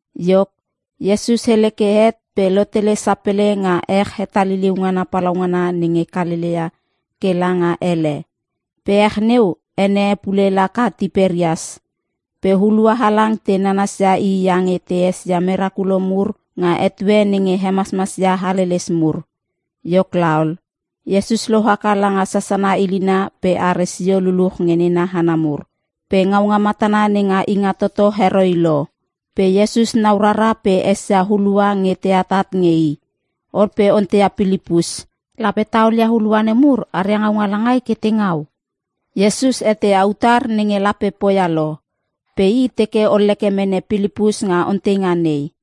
Iok, Iesus hele ke het pe lotele sapele nga ech hetaliliu ngana palaungana nenge Kalelea ke langa ele. (Pe ech neu ene e pule laka Tiperias). Pe hulua halang te nanasia i iange te esia merakulo mur nga etue nenge hemasmas ia haleles mur. Iok laol, Iesus lohaka langa sasana ilina pe are sio luluch nge nena hana mur. Pe ngaunga matana nenga Ingatoto heroi lo. Pe Iesus nau rara pe esia hulua nge te atat nge i. Ol pe onteia Pilipus, “Lape ta olia hulua nemur aria ngaunga langai ke te ngau?” Iesus eteia utar nenge lape poia lo, pe i teke olleke mene Pilipus nga onteinga nei.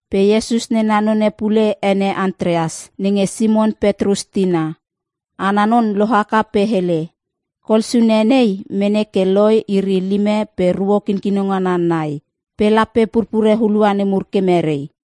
Pe Iesus nena none pule ene Antreas, nenge Simon Petrus tina. Ana non lohaka pe hele, “Kol suna nei mene ke loi iri lime pe ruo kinkino ngana nai. Pe lape purpure hulua nemur ke merei?”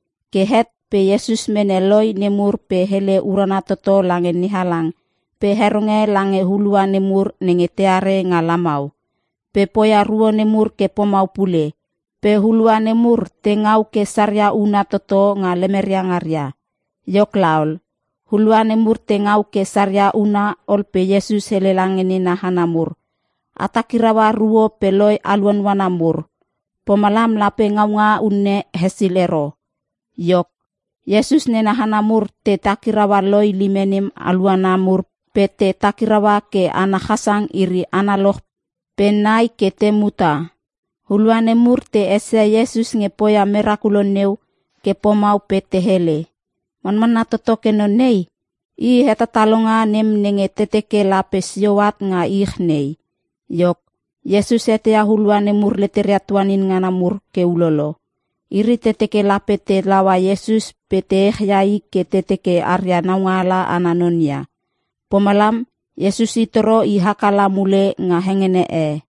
Ke het pe Iesus mene loi nemur pe hele urana toto lange NeHalang pe heronge lange hulua nemur nenge teare nga lamau. Pe poia ruo nemur ke pomau pule pe hulua nemur te ngau ke saria una toto nga lemeria ngaria. Iok laol, hulua nemur te ngau ke saria una ol pe Iesus hele lange nena hana mur, “A takiraua ruo pe loi aluanuana mur. Pomalam lape ngaunga unne hesil ero.” Iok, Iesus nena hana mur te takiraua loi lime nem aluana mur pe te takiraua ke ana chasang iri analoch pe nai ke te muta. Hulua nemur te esia Iesus nge poia merakulo neu ke pomau pe te hele, “Manmanna toto ke non nei, i hetatalonga nem nenge te teke lape sio at nga ich nei.” Iok, Iesus eteia hulua nemur leteria tuanin ngana mur ke ulolo. Iri te teke lape te laua Iesus pe te echia i ke te teke aria naungaala ana non ia. Pomalam Iesus i toro i haka la mule nga hengene e.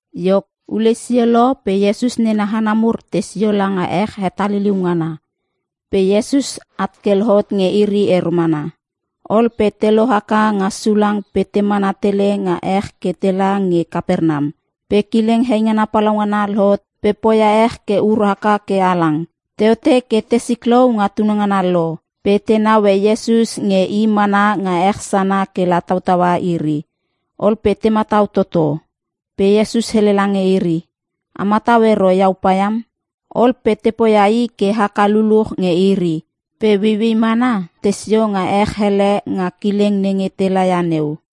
Iok, ulei sio lo pe Iesus nena hana mur tei sio langa ech hetaliliu ngana. Pe Iesus at ke lohot nge iri ero mana. Ol pe te lohaka nga sulang pe te mana tele nga ech ke tela nge Kapernam. Pe kileng heingana palaungana lohot pe poia ech ke ur haka ke halang. Teote ke te siklou nga tunangana lo, pe te naue Iesus nge i mana nga ech sana kela tautaua iri. Ol pe te matau toto. Pe Iesus hele lange iri, “A matau ero iau paiam.” Ol pe te poia i ke haka luluch nge iri, pe ueiuei mana tesio nga ech hele nga kileng nenge te lala ia neu.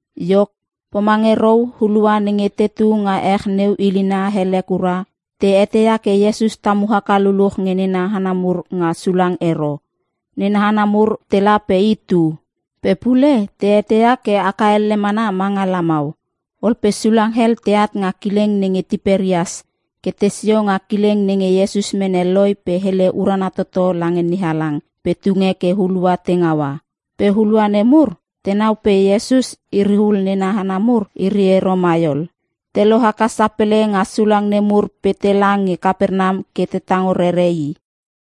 Iok, pomange rou hulua nenge tetu nga ech neu ilina hele kura, te eteia ke Iesus tamu haka luluch nge nena hana mur nga sulang ero. Nena hana mur tela pe i tu. Pe pule te eteia ke aka elle mana ma nga lamau. Ol pe sulang hel teat nga kileng nenge Tiperias ke tesio nga kileng nenge Iesus mene loi pe hele urana toto lange NeHalang pe tunge ke hulua te ngaua. Pe hulua nemur tenau pe Iesus iri hul nena hana mur iri ero mai ol, te lohaka sapele nga sulang nemur pe tela nge Kapernam ke te tango rere i.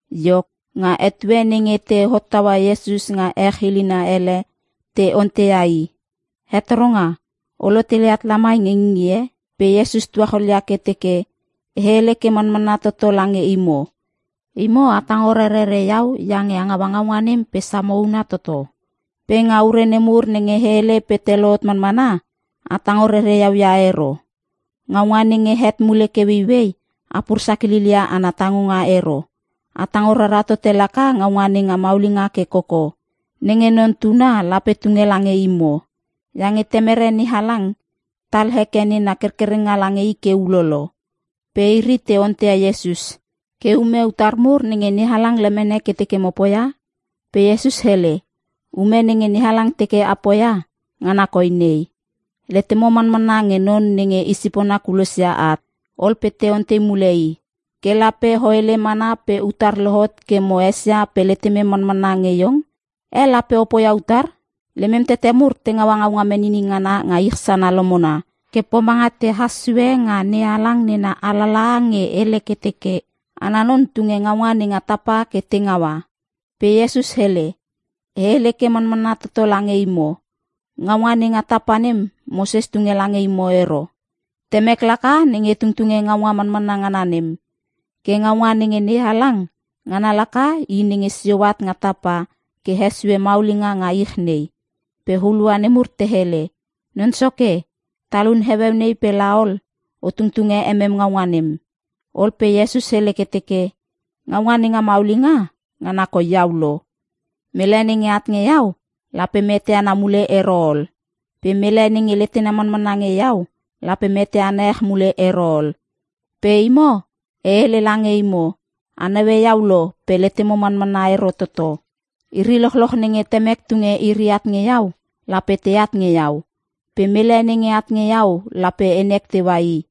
Iok, nga etue nenge te hottaua Iesus nga ech ilina ele, te onteia i, “Hetoronga, O lotele at lamai nge ngingie?” Pe Iesus tuacholia ke teke, “E hele ke manmanna toto lange imo. Imo a tango rerere iau iange a ngaua ngaunga nem pe samo una toto. Pe nga ure nemur nenge e hele pe te lohot manmana, a tango rere iau ia ero. Ngaunga nenge het mule ke ueiuei, a pur sakilil ia ana tangonga ero. A tango rara tote laka ngaunga nenga maulinga ke koko, nenge Non Tuna lape tunge lange imo. Iange Temere NeHalang tal heke nena kerkerenga lange i ke ulolo.” Pe iri te onteia Iesus, “Ke ume utar mur nenge NeHalang lemene ke teke mo poia?” Pe Iesus hele, “Ume nenge NeHalang teke a poia, ngana koi nei: letemo manmanna nge non nenge i sipona kulosia at.” Ol pe te ontei mule i, “Ke lape o hele mana pe utar lohot ke mo esia pe letemem manmanna nge Iong? Eh, lape o poia utar? Lemem tete mur te ngaua ngaunga menini ngana nga ich sana lomona ke pomanga tehas sue nga NeHalang nena alalaha nge hele ke teke, ‘Ana Non tunge ngaunga nenga tapa ke te ngaua.’” Pe Iesus hele, “E hele ke manmanna toto lange imo. Ngaunga nenga tapa nem Moses tunge lange imo ero. Temek laka nenge tungtunge ngaunga manmanna ngana nem. Ke ngaunga nenge NeHalang, ngana laka i nenge sio at nga tapa ke hesue maulinga nga ich nei.” Pe hulua nemur te hele, “Non Soke, talun heueu nei pe la ol, o tungtunge emem ngaunga nem.” Ol pe Iesus hele ke teke, “Ngaunga nenga maulinga, ngana koi iau lo. Mele nenge at nge iau, lape meteana mule ero ol. Pe mele nenge letena manmanna nge iau lape meteana ech mule ero ol. Pe imo e hele lange imo, a naue iau lo pe letemo manmanna ero toto. Iri lochloch nenge Temek tunge iri at nge iau lape teat nge iau. Pe mele nenge at nge iau lape enek teua i.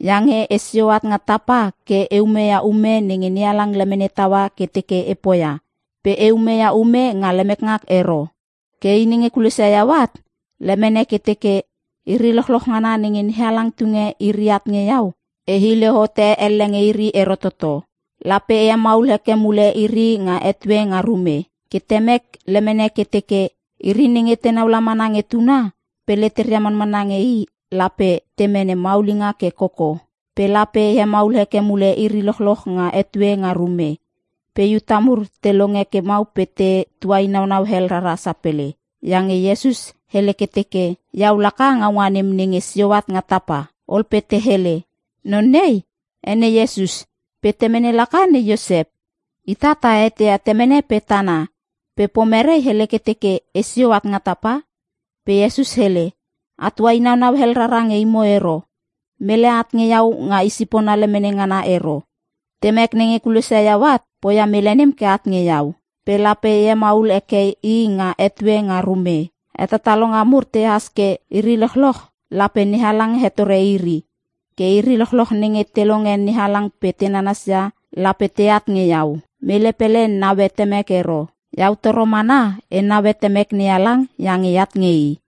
Iange esio at nga tapa ke e umeia ume nenge NeHalang lemene taua ke teke e poia. Pe e umeia ume nga lemek ngak ero. Ke i nenge kulosia iau at lemene ke teke: Iri lochloch ngana nenge NeHalang tunge iri at nge iau, e hile hote elle nge iri ero toto. Lape e hemaul heke mule iri nga etue nga rume. Ke Temek lemene ke teke, iri nenge tenau la mana nge Tuna pe leteria manmanna nge i, lape te mene maulinga ke koko. Pe lape e hemaul heke mule iri lochloch nga etue nga rume.” Pe Iuta mur te longe ke mau pe te tuainaunau hel rara sapele. Iange Iesus hele ke teke, “Iau laka ngaunga nem nenge sio at nga tapa.” Ol pe te hele, “Non nei ene Iesus pe temene laka ne Iosep. Ita ta eteia temene pe tana. Pe pomerei hele ke teke, ‘Esio at nga tapa’?” Pe Iesus hele, “A tuainaunau hel rara nge imo ero. Mele at nge iau nga i sipona lemene ngana ero. Temek nenge kulosia iau at poia mele nem ke at nge iau. Pe lape e hemaul heke i nga etue nga rume. Hetatalonga mur tehas ke, “‘Iri lochloch, lape NeHalang hetore iri.’ Ke iri lochloch nenge te longe NeHalang pe te nanasia, lape teat nge iau. Mele pele naue Temek ero. Iau toro mana e naue Temek NeHalang iange eat nge i.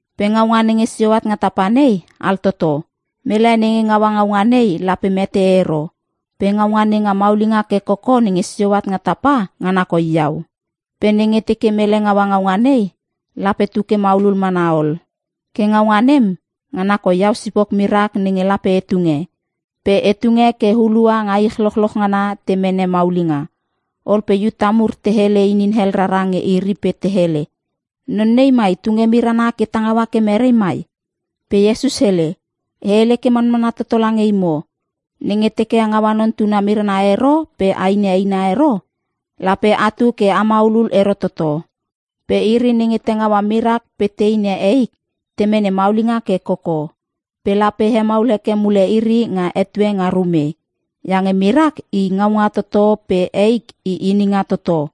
Pe ngaunga nenge sio at nga tapa nei altoto. Mele nenge ngaua ngaunga nei lape mete ero. Pe ngaunga nenga maulinga ke koko nenge sio at nga tapa, ngana koi iau. Pe nenge teke mele ngaua ngaunga nei, lape tu ke maulul mana ol. Ke ngaunga nem, ngana koi iau sipok mirak, nenge lape e tunge. Pe e tunge ke hulua nga ich lochloch ngana te mene maulinga.” Ol pe Iuta mur te hele inin hel rara nge iri pe te hele, “Non nei mai tunge mirana ke ta ngaua ke mere mai?” Pe Iesus hele, “E hele ke manmanna toto lange imo. Nenge teke a ngaua Non Tuna mirana ero pe ainia eina ero, lape atu ke a maulul ero toto. Pe iri nenge te ngaua mirak pe te inia eik, te mene maulinga ke koko. Pe lape e hemaul heke mule iri nga etue nga rume. Iange mirak i ngaunga toto pe eik i ininga toto.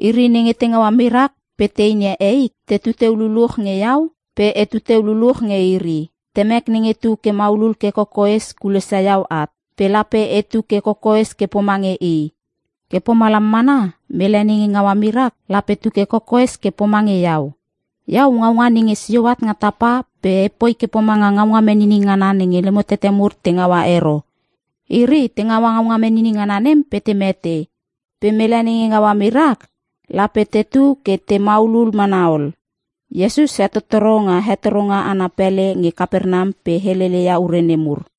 Iri nenge te ngaua mirak pe te inia eik, tetu teu luluch nge iau pe etu teu luluch nge iri. Temek nenge tu ke maulul ke kokoes kulosia iau at, pe lape etu ke kokoes ke pomange i. Ke pomalam mana mele nenge ngaua mirak, lape tu ke kokoes ke pomange iau. Iau ngaunga nenge sio at nga tapa pe epoi ke pomanga ngaunga menini ngana nenge lemo tete mur te ngaua ero. Iri te ngaua ngaunga menini ngana nem pe te mete. Pe mele nenge ngaua mirak, lape tetu ke te maulul mana ol.” Iesus hetottoro nga hetoronga ana pele nge Kapernam pe helele ia ure nemur.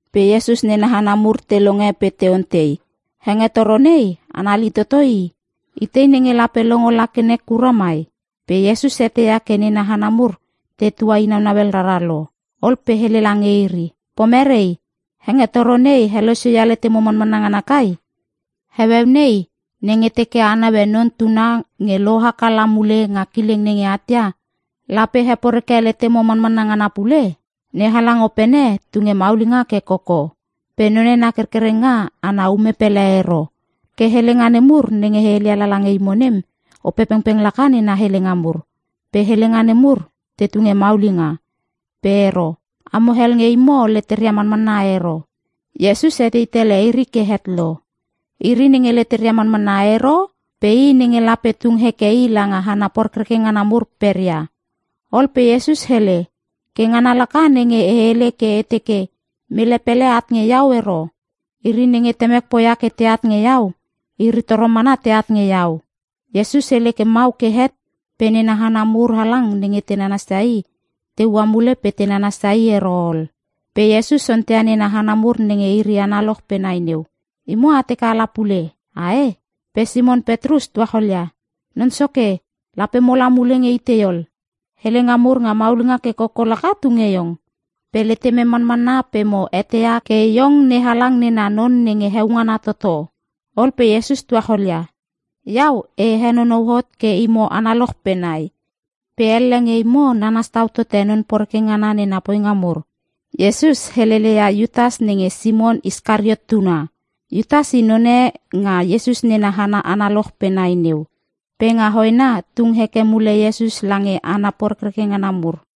Pe Iesus nena hana mur te longe pe te ontei, “Hengetoro nei anali toto i. Itei nenge lape longo la ke nek kura mai?” Pe Iesus eteia ke nena hana mur te tuainaunau hel rara lo. Ol pe hele lange iri, “Pomerei? Hengetoro nei helosio ia letemo manmanna ngana kai? Heueu nei, nenge teke a naue Non Tuna nge lohaka la mule nga kileng nenge at ia, lape heporeke letemo manmanna ngana pule? NeHalang Opene tunge maulinga ke koko; pe none na kerkerenga ana ume pele ero. Ke helenga nemur nenge e heleia lala nge imo nem, Opepengpeng laka nena helenga mur. Pe helenga nemur te tunge maulinga. Pe ero. Amo hel nge imo leteria manmanna ero.” Iesus etei tele iri ke het lo. Iri nenge leteria manmanna ero pe i nenge lape tung heke i langa hana porekreke ngana mur pereia. Ol pe Iesus hele, “Ke ngana laka nenge e hele ke e teke, ‘Mele pele at nge iau ero. Iri nenge Temek poia ke teat nge iau, iri toro mana teat nge iau.’” Iesus hele ke mau ke het pe nena hana mur halang nenge te nanasia i, te ua mule pe te nanasia i ero ol. Pe Iesus onteia nena hana mur nenge iri analoch pe nai neu, “Imo a teke ala pule, ae?” Pe Simon Petrus tuacholia, “Non Soke, lape mola mule nge itei ol? Helenga mur nga maulinga ke koko laka tunge Iong. Pe letemem manmanna pe mo eteia ke Iong NeHalang nena non nenge heongana toto.” Ol pe Iesus tuacholia, “Iau, e henonou hot ke imo analoch pe nai. Pe elle nge imo nanas tau tote non poreke ngana nena poinga mur.” Iesus helele ia Iutas nenge Simon Iskariot tuna. Iutas i none nga Iesus nena hana analoch pe nai neu. Pe nga hoena tung heke mule Iesus lange hana porekreke ngana mur.